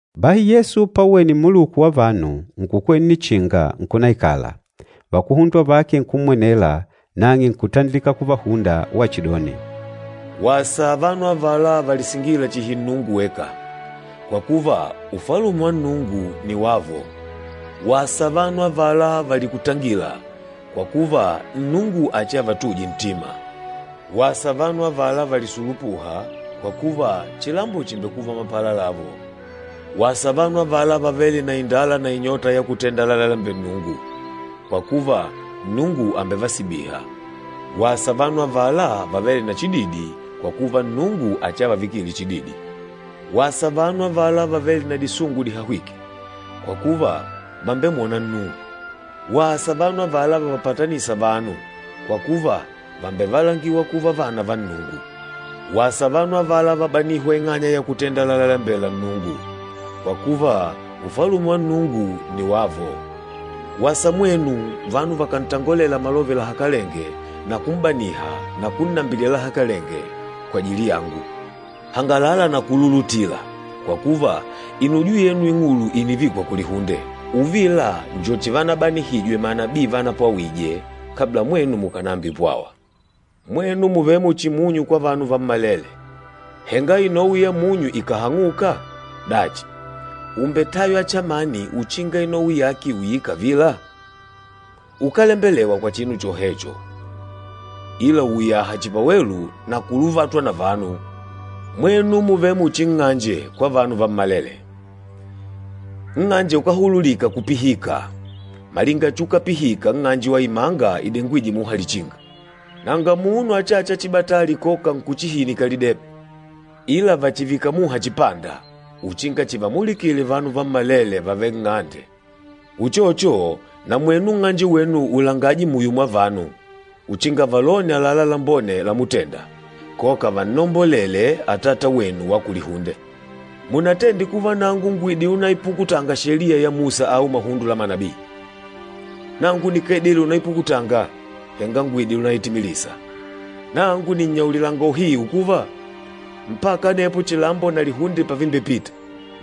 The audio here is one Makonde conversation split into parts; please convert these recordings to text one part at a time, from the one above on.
Bahi Yesu pauwene mmuluku wa vanu, nkukwela nnichinga, nkunaikala. Vakuhundwa vake nkummwenela, nang'e nkutandilika kuvahunda wachidoni, “Wasa vanu avala valisingîla chihi Nnungu weka, kwa kuva, Ufalume wa Nnungu nni wavo. Wasa vanu avala valikutangîla, kwa kuva, Nnungu achiavatuje ntima. Wasa vanu avala valisulupûha, kwa kuva, chilambo chimbekuva mapala lavo. Wasa vanu avala vavêle na indala na inyota ya kutenda lalalembela Nnungu, kwa kuva, Nnungu àmbevasibiha. Wasa vanu avala vavêle na chididi, kwa kuva, Nnungu achiavavikile chididi. Wasa vanu avala vavêle na disungu dihahwîke, kwa kuva, vàmbemwona Nnungu. Wasa vanu avala vavapatanîsa vanu, kwa kuva, vàmbevalangiwa kuva vana va Nnungu. Wasa vanu avala valagîhwa ing'anya ya kutenda lalalembela Nnungu, kwa kuva, Ufalume wa Nnungu nni wavo. Wasa mwenu, vanu vakàntangolela malove lahakalenge na kum'baniha na kunnambilila lahakalenge, kwajili yangu. Hangalala na kululutila, kwa kuva, inujo yenu ing'ulu ìnivikwa kulihunde. Uvila njo chivanananihijwe manabii vanapwawije, kabla mwenu mukànambipwawa.” “Mwenu mùvele muchi munyu kwa vanu vammalele. Henga inowi ya munyu ikàhang'uka, dachi, ùmbetaywa chamani uchinga inowi yake iuyile kavila? Ukálembelewa kwa chinu chohecho, ila uuyaha chihi pawelu na kuluvatwa na vanu. Mwenu mùvele muchi nng'anje kwa vanu vammalele, nng'anje ukáhululika kupihika, malinga chuukapihika nng'anje wa imanga idengwîje muha lichinga. Nanga munu achâcha chibatali koka nkuchihinika lidebe, ila vàchivika muha chipanda, uchinga chivamulikile vanu vammalele vàvele nng'ande. Uchocho, na mwenu nng'anje wenu ulangaje muyo mwa vanu, uchinga valone àlalá lambone lamutenda, koka vannombolele Atata wenu wa kulihunde.” “Munatende kuva nangu ngùidile unaipukutanga Sheliya ya Musa au mahundo la manabii. Nangu nikáidile unaipukutanga, henga ngùidile unaitimilisa. Nangu nìnnyaulilanga uhiu kuva, mpaka anepo chilambo na lihunde pavimbepita,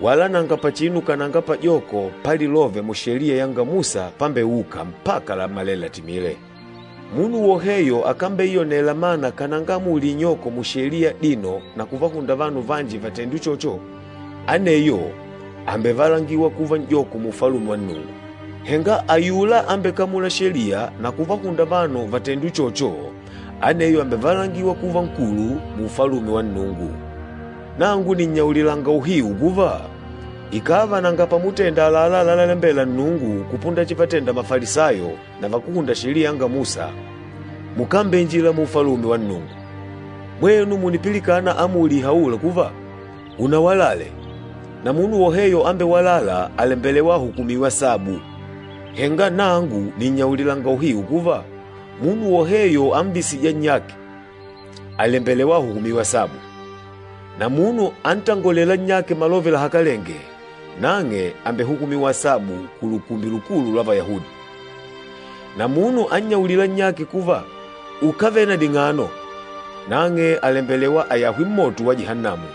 wala nanga pachinu kananga pajoko pa lilove mu Sheliya yanga Musa pambeûka mpaka lammelele latimile. Munu woheyo akambeiyonela mana kananga amuli inyoko mu Sheliya adino na kuvahunda vanu vanji vatende uchocho, aneyo àmbevalangiwa kuva n'joko mu Ufalume wa Nnungu. Henga ayula ambekamûla Sheliya na kuvahunda vanu vatende uchocho, aneyo àmbevalangiwa kuva nkulu mu Ufalume wa Nnungu. Nangu nìnnyaulilanga uhiu kuva, ikàva nanga pamutenda àlalá lalalembela Nnungu kupunda chivatenda Mafalisayo na vakúhunda Sheliya yanga Musa, mukámbeinjila mu Ufalume wa Nnungu.” “Mwenu mùnipilikana amuli ihaûla kuva, ‘Unawalale, na munu woheyo ambewalâla àlembelewa ahukumiwe asabu.’ Henga nangu nìnnyaulilanga uhiu kuva, munu woheyo amvisîja nnyake, àlembelewa ahukumiwe asabu. Na munu antangolêla nnyake malove lahakalenge, nang'e àmbehukumiwa asabu ku Lukumbi Lukulu lwa Vayahudi. Na munu annyaulîla nnyake kuva, ‘Ukávele na ding'ano’ nang'e àlembelewa ayahwe mmoto wa Jihannamu.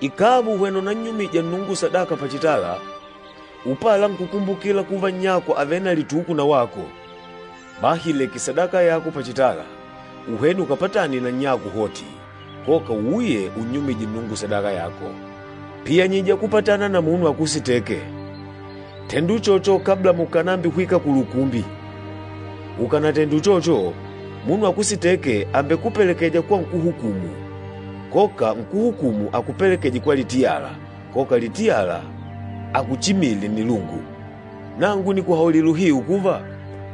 Ikàva ùhwena unannyumija Nnungu sadaka pachitala, upala nkukumbukila kuva nnyako àvele na lituku na wako, bahi ileke sadaka yako pachitala, uhwene ukapatane na nnyako hoti, koka uuye unnyumije Nnungu sadaka yako. Piyanyija kupatana na munu akusitêke, tenda uchocho kabla mukànambihwika kulukumbi. Ukanatende uchocho, munu akusitêke àmbekupelekeja kwa nkúhukumu, koka nkúhukumu akupelekeje kwa litiyala, koka litiyala akuchimile nnilungu. Nangu nìkuhaulila uhiu kuva,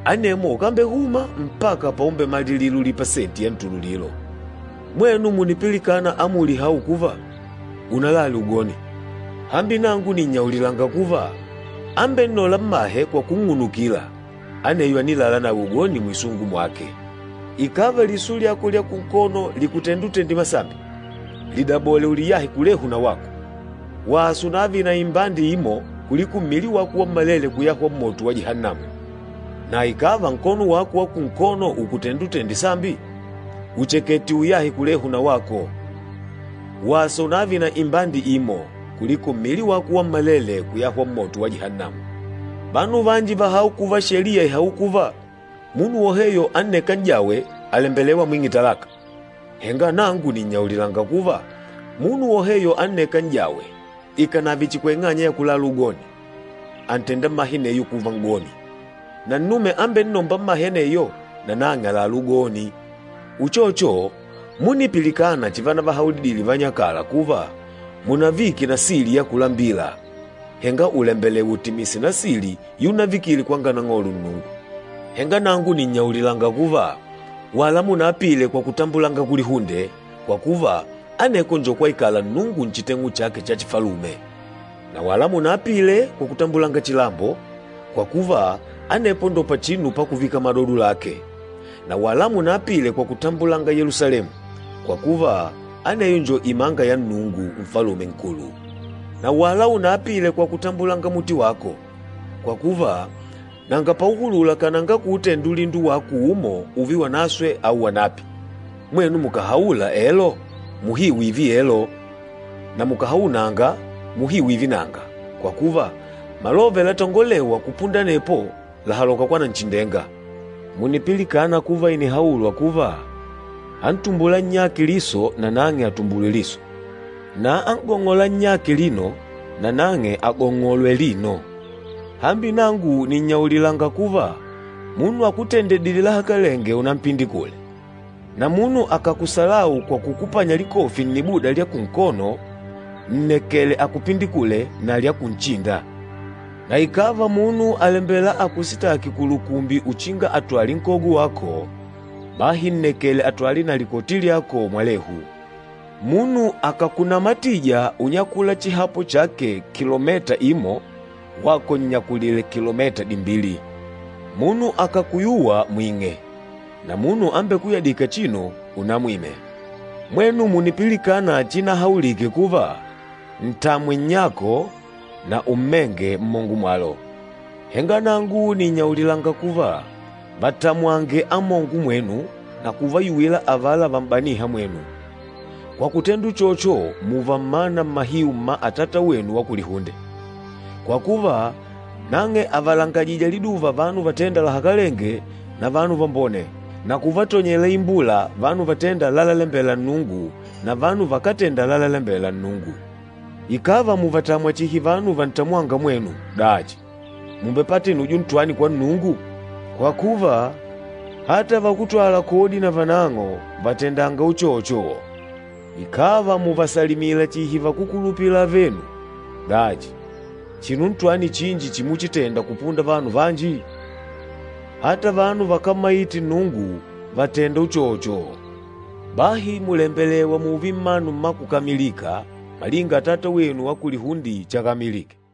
anemwo ukambehuma mpaka paumbemalilila ulipa senti ya ntululilo.” “Mwenu mùnipilikana amuli ihaûla kuva, ‘Unalale ugoni.’ Hambi nangu nìnnyaulilanga kuva, ambennôla mmahe kwa kunng'unukila, aneyo ànilala nawe ugoni mwisungu mwake. Ikàva liso lyako lya kunkono lìkutenda utende sambi, lidabole uliyahe kulehu na wako! Wasa unààve na imbande imo, kuliko mmili wako wammalele kuyahwa mmoto wa Jihannamu. Na ikàva nkono wako wa kunkono ùkutenda utende sambi, uchekete uuyahe kulehu na wako! Wasa unààve na imbande imo, kuliko mmili wako wammalele kuyahwa mmoto wa Jihannamu.” “Vanu vanji vàhaula kuva Sheliya ìhaula kuva, ‘Munu woheyo annêka n'jawe, àlembelewa amwing'e talaka.’ Henga nangu nìnnyaulilanga kuva, munu woheyo annêka n'jawe, ikànave chihi kwa ing'anya ya kulala ugoni, àntenda mmahe aneyo kuva n'goni, na nnume ambennômba mmahe aneyo, nanang'e àlalá ugoni.” “Uchocho, múnipilikana chivanavahaulidile vanyakala kuva, ‘Munavike nasili ya kulambila, henga ùlembelewa utimise nasili yunavikile kwanga Nang'olo Nnungu.’ Henga nangu nìnnyaulilanga kuva, wala munaapile kwa kutambulanga kulihunde, kwa kuva, aneko njo kwaikala Nnungu nchiteng'u chake cha chifalume. Na wala munaapile kwa kutambulanga chilambo, kwa kuva, anepo njo pachinu pakuvika madodo lake, na wala munaapile kwa kutambulanga Yelusalemu, kwa kuva, aneyo njo imanga ya Nnungu, Nfalume Nkulu. Na wala unaapile kwa kutambulanga muti wako, kwa kuva, nanga pauhulula kananga kuutenda ulindo wako umo ùùve wanaswe au wanapi. Mwenu mukàhaula, ‘Elo,’ muhiu ììve elo, na mukàhaula, ‘Nanga,’ muhiu ììve nanga, kwa kuva, malove latongolêwa kupunda anepo làhaloka kwa Nanchindenga.” “Mùnipilikana kuva ìnihaulwa kuva, ‘Antumbûla nnyake liso nanang'e atumbulwe liso, na an'gong'ôla nnyake lino nanang'e agong'olwe lino.’ Hambi nangu nìnnyaulilanga kuva, munu akutendedîle lahakalenge unampindikule. Na munu akàkuhebula kwa kukupanya likofi nnibuda lya kunkono, nnekele akupindikulile na lya kunchinda. Na ikàva munu àlembela akusitaki kulukumbi uchinga atwale nkogo wako, bahi nnekele atwale na likoti lyako mwalehu. Munu akàkunamatija unyakula chihapo chake kilomita imo, wako nnyakulile kilomita dimbili. Munu akàkuyuwa mwing'e, na munu ambekuyadîka chinu unamwime.” “Mwenu mùnipilikana chiinahaulike kuva, ‘Ntamwe nnyako, na ummenge mmongo mwalo.’ Henga nangu nìnnyaulilanga kuva, vatamwange amongo mwenu na kuvayuwila avala vam'baniha mwenu, kwa kutenda uchocho mùùva mmana mmahiu mma Atata wenu wa kulihunde. Kwa kuva, nang'e àvalangajija liduva vanu vatênda lahakalenge na vanu vambone, na kuvatonyele imbula vanu vatênda lalalembela Nnungu na vanu vakátenda lalalembela Nnungu. Ikàva mùvatamwa chihi vanu vantamwânga mwenu, dachi, mùmbepata inujo ntwani kwa Nnungu? Kwa kuva, ata vakútwala kodi na vanang'o vàtendanga uchocho! Ikàva mùvasalimila chihi vakúkulupila avenu, dachi chinu ntwani chinji chimuchitenda kupunda vanu vanji? Ata vanu vakámmaite Nnungu vàtenda uchocho. Bahi mùlembelewa mùùve mmanu mmakukamilika malinga Atata wenu wa kulihunde chakamilike.”